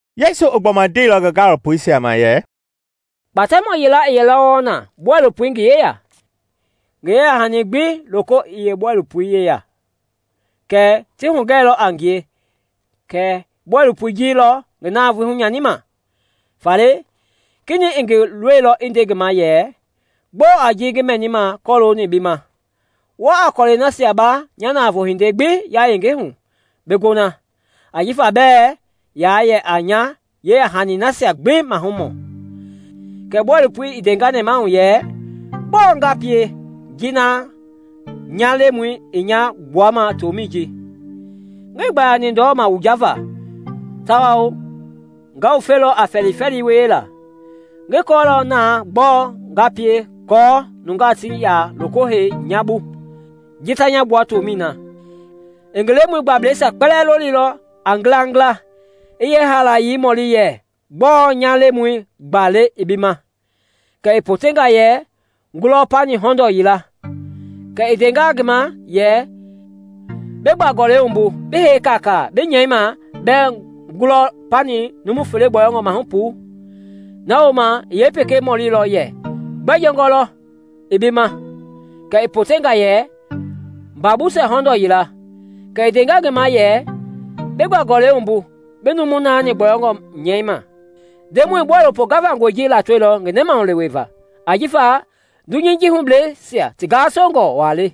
Yesu i gbɔma ndeilɔ ngi gaalopoisia ma yɛ, “Kpatɛmɔ yila i yɛlɔ wɔɔ na bɔilopo i ngi yeya, ngi yeyahani gbi loko i yeebɔilopoi yeya; kɛɛ ti hugɛilɔ a ngie kɛ bɔilopoi ji lɔ ngi navoei hunyanima. Faale kenɛi i ngi lolilɔ i nde ngi ma yɛ, ‘Gbɔɔ a ji ngi mɛnima kɔlooni bi ma? Wa a kɔlɛi nasia ba nya navoo hindei gbi yayenge hu bi gona, ajifa bɛɛ ya yɛ a nya yeyahanisia gbi mahumɔ.’ Kɛ bɔilopoi i ndenga nɛmahu yɛ, ‘Gbɔɔ nga pie ji na nya lemɔi i nya gbuama tomɛi ji? Ngii gbayani ndɔma wujava, tawao nga wufelɔ a fɛlifɛli wiela. Ngi kɔɔlɔ na gbɔɔ nga pie aako nungaa ti ya loko hei nya bu ji ta nya gbua tomɛi na.’ I ngi lemɔi gbablɛisia kpɛlɛɛ lolilɔ a ngilangila i yeehaalayei mɔli yɛ, ‘Gbɔɔ nya lemɔi gba le i bi ma?’ Kɛ i potenga yɛ, ‘ngulɔ pani hɔndɔɔ yila.’ Kɛ i ndenga ngi ma yɛ, ‘Bi gba-gɔlɛi wumbu, bi hei kaakaa, bi nyɛi ma bɛɛ ngulɔ pani numu fele gbɔyɔngɔ mahu puu.’ Na wooma i pekei mɔlilɔ yɛ, ‘Gbɛ jɔngɔ lɔ i bi ma?’ Kɛ i potenga yɛ, ‘Mba busɛ hɔndɔɔ yila.’ Kɛ i ndenga ngi ma yɛ, ‘Bi gba- gɔlɛi wumbu bi numu naani gbɔyɔngɔ nyɛi ma.’ Ndemɔi i bɔilopo gavangɔi ji latoilɔ ngi nɛmahulewei va; ajifa dunyei ji hubleisia ti gasongɔ wa le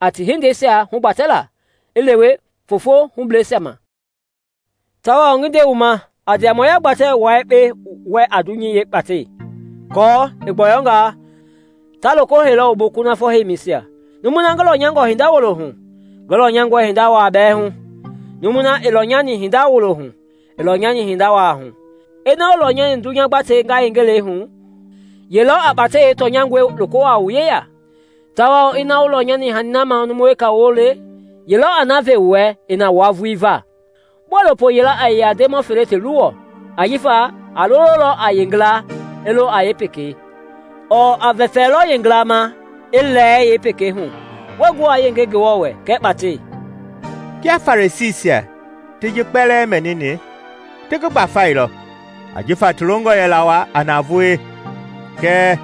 a ti hindeisia hugbatɛla i lewe fofoi hubleisia ma. “Tawao ngi nde wu ma, a ndiamɔya gbatɛ wua yekpe wɛ a dunyei yeekpatɛi, aako i gbɔyɔngaa, ta loko heilɔ wu bu kunafɔ heimisia. Numui na ngi lɔnyangɔ hinda wulo hu, ngi lɔnyangɔe hinda wa bɛɛ hu; numui na ii lɔnyani hinda wulo hu, ii lɔnyani hinda wa hu. Ina wuii lɔnyani dunya gbatei yayengelɛi hu, ye lɔ a kpatɛi yeetɔnyangɔi loko wua wu yeya? Tawao ina wuii lɔnyani hani na mahu numu weka woo le, ye lɔ a na ve wu wɛ i na wua vulii va? “Bɔilopo yila ɛɛ yɛ a ndemɔ fele ti luwɔ; ajifa a lololɔ a yeengila i lo a yeepekei ɔɔ a vɛfɛlɔ yeengila ma i lɛɛ yeepekei hu. Wɛɛ gu wa yenge Ngewɔ wɛ kɛɛ kpatɛi.” Kia Farisiisia ti ji kpɛlɛɛ mɛnini, ti ngi gbafailɔ ajifa ti longɔ yɛla wa a navoei. Kɛɛ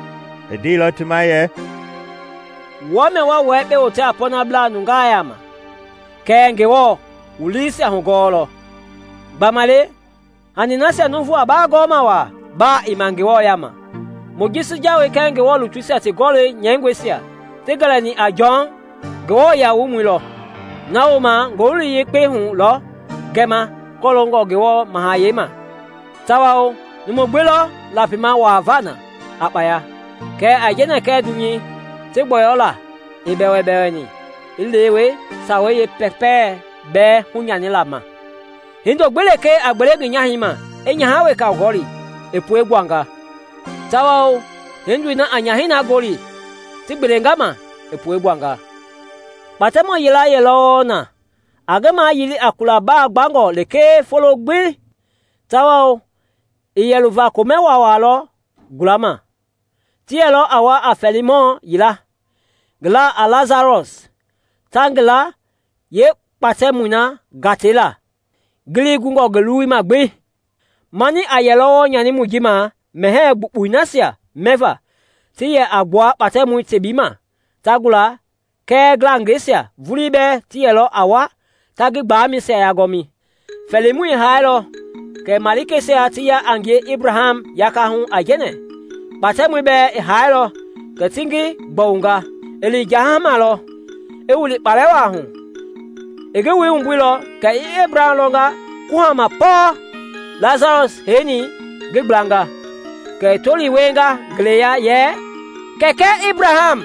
i ndeilɔ ti ma yɛ, “Wua mia wa wua yekpe wote a pɔɔnablaa nungaa yaama kɛɛ Ngewɔ i wu liisia hugɔɔlɔ. Gbamaile hani nasia nuuvu a ba gɔɔ ma wa, baa ii ma Ngewɔ yaama. “Mojisi jawei kɛɛ Ngewɔ lutuisia ti gɔlɔ nyɛingɔisia ti gɛlɛni a Jɔn Nguamɔi lɔ; na wooma Ngowili Yekpei hu lɔ gɛma kɔloongɔ Ngewɔ Mahayɛi ma, tawao numui gbi lɔ lapima wuavaa na a kpaya. Kɛɛ aijɛnɛ kɛɛ dunya ti gbɔyɔlaa i bɛwɛbɛwɛni i lewe sawei yeepɛpɛ bɛɛ hunyanila ma. “Hindo gbi lekee a gbele ngi nyahɛi ma, i nyaha weka gɔli, i pue gbuanga; tawao hindoi na a nyahɛi na gɔli ti gbeelenga ma, i pue gbuanga. “Kpatɛmɔ yila yɛlɔ wɔɔ na a ngi mayili a kula ba gbangɔ lekee folo gbi tawao i yɛ luva komɛ waawaa lɔ gulama. Ti yɛlɔ a wa a fɛɛlimɔ yila, ngi la a Lasarɔs, ta ngi la yeekpatɛmɔi gatei la, ngelei gungɔ ngi luwuma gbi. Mani a yɛlɔ wɔɔ nyanimɔi ji ma mɛhɛɛ gbukpui nasia mɛva ti yɛ a gbua kpatɛmɔi tebii ma ta gula kɛɛ ngilangɛisia vulii bɛɛ ti yɛlɔ a wa ta ngi gbalɛmɛisia yagɔmi. Fɛɛlimɔi i hailɔ kɛ malikeisia ti ya a ngie Ebraham yakahu aijɛnɛ. Kpatɛmɔi bɛɛ i hailɔ kɛ ti ngi gbɔwunga. I lini jahama lɔ, i wili kpalɛ wa hu. I ngi wui wumbuilɔ kɛ i Ebraham lɔnga kuhama pɔɔ, Lasarɔs i heini ngi gblanga. Kɛ i tolii wienga ngeleya yɛ, ‘Kɛkɛ Ebraham!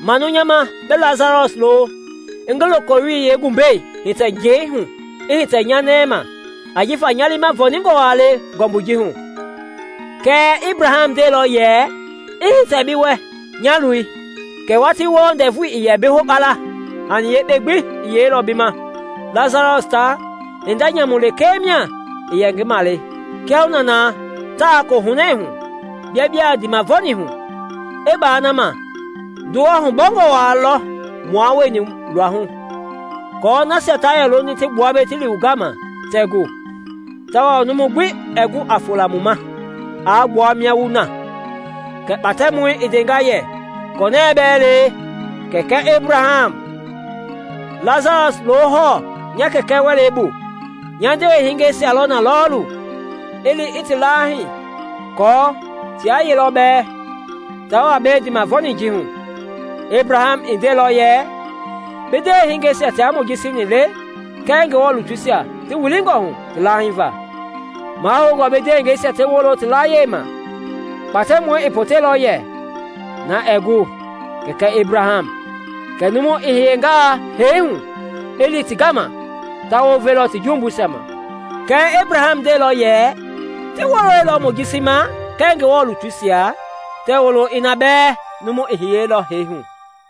Manu nya ma bi Lasarɔs lo i ngi lokoyiwoi yeengumbɛi hitɛ njɛi hu i hitɛ nya nɛi ma ajifa nya liima vɔɔningɔ wa le ngɔmbui ji hu.’ Kɛɛ Ebraham ndeilɔ yɛ, ‘I hitɛ bi wɛ, nya loi, kɛ watii wɔɔ ndɛvu i bi hokpala, hani yekpei gbi i yeilɔ bi ma, Lasarɔs ta hinda nyamu lekee mia i yɛ ngi male. Kiahuna na ta kohunɛ hu, bia biaa ndiimavɔɔni hu. I baa na ma, ndowa hubɔngɔ wa lɔ mua wueni luahu, aako nasia ta yɛ loni ti gbua mbei ti li wu gama, tɛɛ gu, tawao numu gbi ɛɛ gu a fola mu ma aa gbua mia wu na.’ Kɛ kpatɛmɔi i ndenga yɛ, ‘Kɔnɛɛ bɛɛ le, Kɛkɛ Ebraham, Lasarɔs lo hɔɔ nya kɛkɛ wɛlei bu. Nya ndewehingɛisia lɔ na lɔɔlu. I li i ti lahii aako tia yelɔ bɛɛ ta wa mbei ndiimavɔɔni ji hu.’ Ebraham ndeilɔ yɛ, ‘Bi ndewehingeisia tia Mojisi ni le kɛɛ Ngewɔ lutuisia ti wilingɔhu ti lahiiva; mahoungɔ bi ndewengɛisia ti wolo ti layie ma.’ Kpatɛmɔi i poteilɔ yɛ, ‘Na ɛɛ gu, Kɛkɛ Ebraham! Kɛɛ numu i hiyengaa hee hu i li ti gama, ta wounvelɔ ti jumbuisia ma.’ Kɛɛ Ebraham ndeilɔ yɛ, ‘Tii woloilɔ Mojisi ma kɛɛ Ngewɔ lutuisia, tɛɛ wolo ina bɛɛ numu i hiyeilɔ hee hu.’”